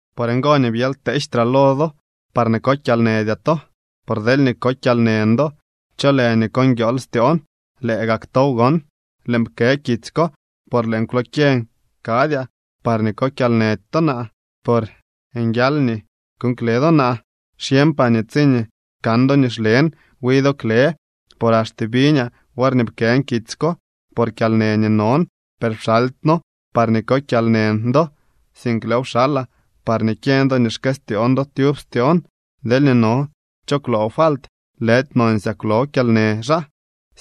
Por ngo nii byely kteejtraa lo do parñee ko kyalnëdyaa to. Por deelñee ko kyalnën do, ¿cho lë nii ko nguiool styoon? Lëë gak tow gon. Lëën pkë kitsy ko por lëën kwlokyeñ kadyaa parñee ko kyalnëdy to naa, por nguial nii kuuñ kle do naa. Xyeñpaa nii tsiñee kan do nii xlen, wi do kle. Por axte biñaa worñee pkën kitsy ko, por kyalnë nii non. Per pxaldyno parñee ko kyalnën do, sink lëëw pxalaa parñee kyeñ do nii xkëstyoon do tyub styoon. Deelñee no cho kwloo falt, lëdy nonsyaa kwloo kyalnë xaa,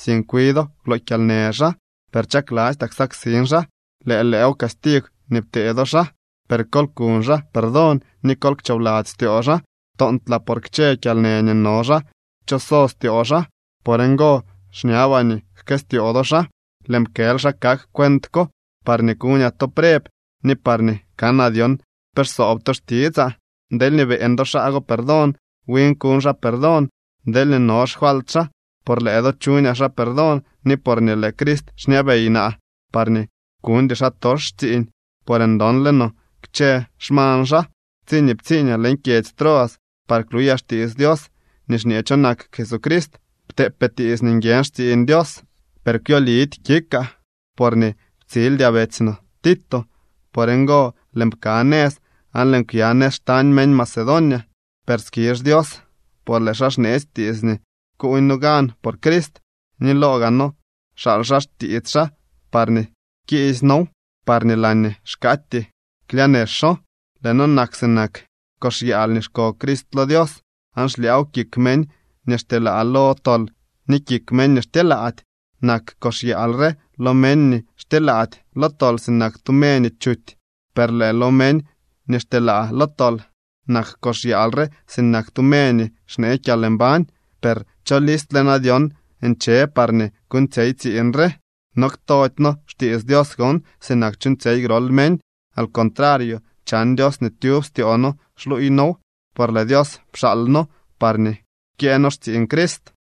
sink wi do kwloo kyalnë xaa, per chaklastyaa ksaksin xaa. Lëë lew castigw nii ptee do xaa. Per kol kuñ xaa perdón ni kol kchoobladzy styoo xaa. Toontlaa por kchë kyalnë nii no xaa kchoso styoo xaa. Por ngo xñabaa nii jkëstyoo do xaa. Lëën pkël xa kak cuent ko, parñee kuñaa to preb ni parñee kanaa dyon pe xsoob to xtitsaa. Deelñee beeñ do xaa go perdón, win kuñ xaa perdón, deelñee no xfalt xaa. Por lëë do chuñaa xaa perdón ni porñee lëë Crist xñabey naa, parñee kuñdy xaatox xtsiiñ, por ndonle no kchë xmañ xaa. Tsiñee ptsiiñaa leñ kyedzy Troas par kluyaa xtiits Dios nii xñee cho nak Jesucrist, pteepee tiits nii nguiën xtsiiñ Dios. Per kwyo lidy kikaa porñee ptsildyaa betsy no Tito. Por ngo lëën pka nëz aan lëën kwya nëz xtañ meñ Macedonia. Per skizh Dios, por lëë xaa xneetsy tiits nii kuuñ noo gan por Crist, ni loo gaa noo xaal xaa xtiits xaa parñee kiisy noow, parñee laañee xkaatyee klyaa nexo. Lëë noo nak sinak kox yaal nii xko Crist lo Dios, aan xlyaaw kik meñ nii xtyelaa lo tol ni kik meñ nii xtyelaady. Nak kox yaal re lo meñ nii xtyelaady lo tol sinak tu me nii chuty, per lëë lo meñ nii xtyelaa lo tol nak kox yaal re sinak tu me nii xnee kyalmbañ. Per ¿cho listle na dyon nche par kuuñtsyey tsiiñ re? No ktody noo xtiits Dios gon, sinak chuuñtsyey grol meñ. Al contrario chan Dios nii tyub styoo noo xluuy noow, por lëë Dios pxaal noo parñee kyëë noo xtsiiñ Crist.